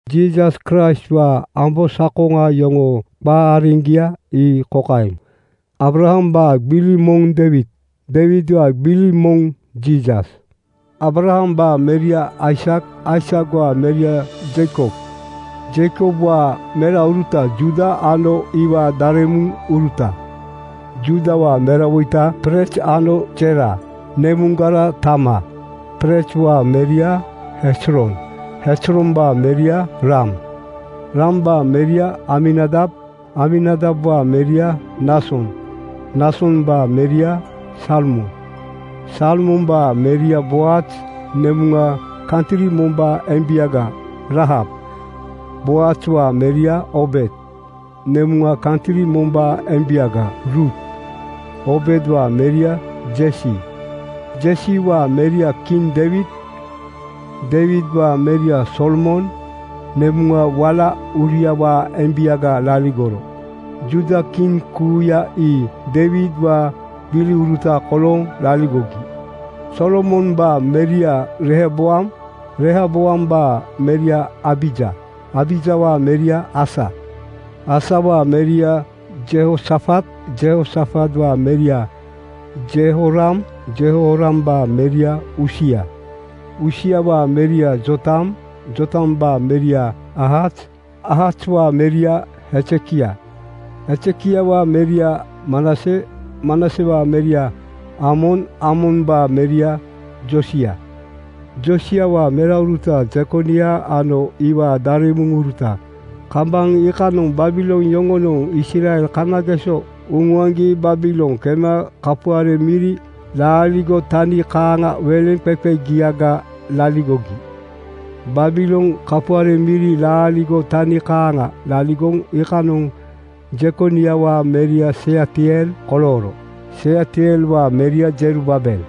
Jiisas Kraistwaa ambosakoŋa yoŋoo qa areŋgia ii kokaeŋ: Aabrahambaa gbili moŋ Deiwid. Deiwidwaa gbili moŋ Jiisas. Aabrahambaa meria Aisak. Aisakwaa meria Jeikob. Jeikobwaa merauruta Juuda ano iwaa daremuŋuruta. Juudawaa merawoita Perez ano Zera, nemuŋgara Taamar. Perezwaa meria Hezron. Hezrombaa meria Ram. Rambaa meria Aminadab. Aminadabwaa meria Naason. Naasombaa meria Salmon. Salmombaa meria Boaz, nemuŋa kantri mombaa embiaga Raahab. Boazwaa meria Oobed, nemuŋa kantri mombaa embiaga Ruut. Oobedwaa meria Jesi. Jesiwaa meria kiŋ Deiwid. Deiwidwaa meria Solomon, nemuŋa wala Uriawaa embiaga laligoro. Juuda kiŋ kuuya ii Deiwidwaa gbiliuruta kolooŋ laligogi. Solomombaa meria Rehoboam. Rehoboambaa meria Abija. Abijawaa meria Asa. Asawaa meria Jehosafat. Jehosafatwaa meria Jehoram. Jehorambaa meria Usia. Usiawaa meria Jootam. Jootambaa meria Aahaz. Aahazwaa meria Hezekia. Hezekiawaa meria Manase. Manasewaa meria Aamon. Aamombaa meria Joosia. Joosiawaa merauruta Jekonia ano iwaa daremuŋuruta. Kambaŋ iikanoŋ Babilon yoŋonoŋ Israel kanageso uŋuaŋgi Babilon kema kapuare miri laaligo tani kaaŋa weleŋqeqegiaga laligogi. Babilon kapuare miri laaligo tani kaaŋa laligoŋ iikanoŋ Jekoniawaa meria Sealtiel kolooro. Sealtielwaa meria Jerubaabel.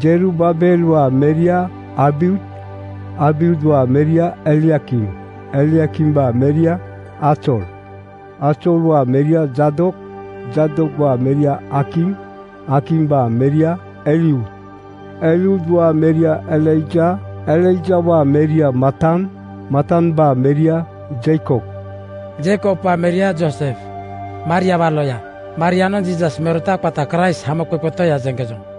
Jerubaabelwaa meria Abiud. Abiudwaa meria Eliakim. Eliakimbaa meria Azor. Azorwaa meria Jaadok. Jaadokwaa meria Akim. Akimbaa meria Eliud. Eliudwaa meria Eleazar. Eleazarwaa meria Matan. Matambaa meria Jeikob. Jeikobwaa meria Joosef, Mariawaa loya. Marianoŋ Jiisas merota qata Kraist Hamoqeqe Toya jeŋkejoŋ.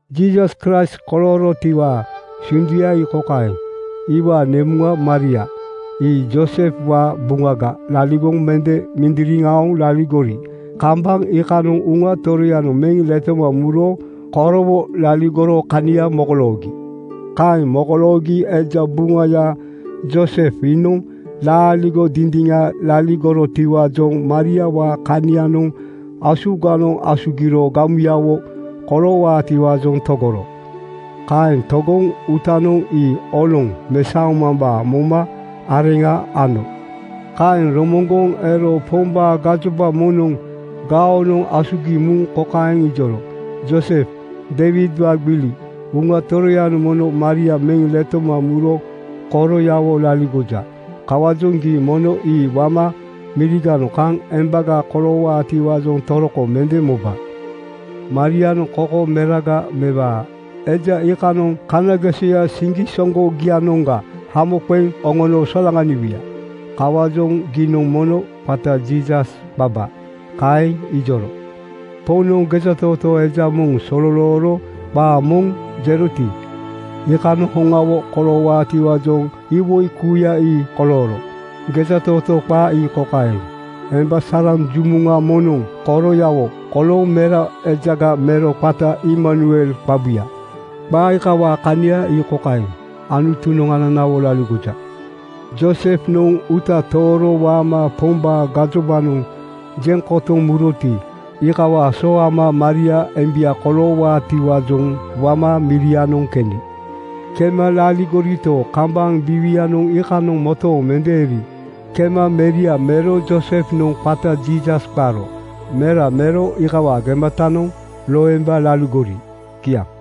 Jiisas Kraist koloorotiwaa sunduya ii kokaeŋ: Iwaa nemuŋa Maria ii Joosefwaa buŋaga laligoŋ mende mindiriŋ aoŋ laligori kambaŋ iikanoŋ Uŋa Toroyanoŋ meŋ letoma muro korowo laligoro kania mokoloogi. Kaeŋ mokoloogi eja buŋaya Joosef iinoŋ laaligo dindiŋa laligorotiwaajoŋ Mariawaa kanianoŋ asuganoŋ asugiro gamuyawo koloowaatiwaajoŋ togoro. Kaeŋ togoŋ uutanoŋ ii oloŋ mesaomambaa momo areŋa ano. Kaeŋ romoŋgoŋ ero Pombaa gajoba moŋnoŋ gaonoŋ asugiŋ muŋ kokaeŋ ijoro, “Joosef Deiwidwaa gbili, Uŋa Toroyanoŋ mono Maria meŋ letoma muro koroyawo laligoja. Kawaajoŋ gii mono ii wama miriganoŋ kaŋ embaga koloowaatiwaajoŋ toroko mende moba. Marianoŋ koko meraga mewaa. Eja iikanoŋ kanagesoya siŋgisoŋgogianoŋga hamo qeŋ oŋono solaŋaniwuya. Kawaajoŋ giinoŋ mono qata Jiisas qaba.” Kaeŋ ijoro. Poŋnoŋ gejatootoo eja moŋ sololooro qaa moŋ jeroti, iikanoŋ hoŋawo koloowaatiwaajoŋ iwoi kuuya ii kolooro. Gejatootoo qaa ii kokaeŋ, “Emba saraŋ jumuŋa moŋnoŋ koroyawo kolooŋ mera ejaga mero qata Imanuel qabuya.” Qa iikawaa kania ii kokaeŋ, “Anutunoŋ ananawo laligoja.” Joosefnoŋ uuta tooro waama Pombaa gajobanoŋ jeŋ kotoŋ muroti, iikawaa so ama Maria embia koloowaatiwaajoŋ wama mirianoŋ keni. Kema laligorito, kambaŋ biiwianoŋ iikanoŋ motooŋ mende eri kema meria mero Joosefnoŋ qata Jiisas qaro. Mera mero iikawaa gematanoŋ loemba laligori. Kiaŋ.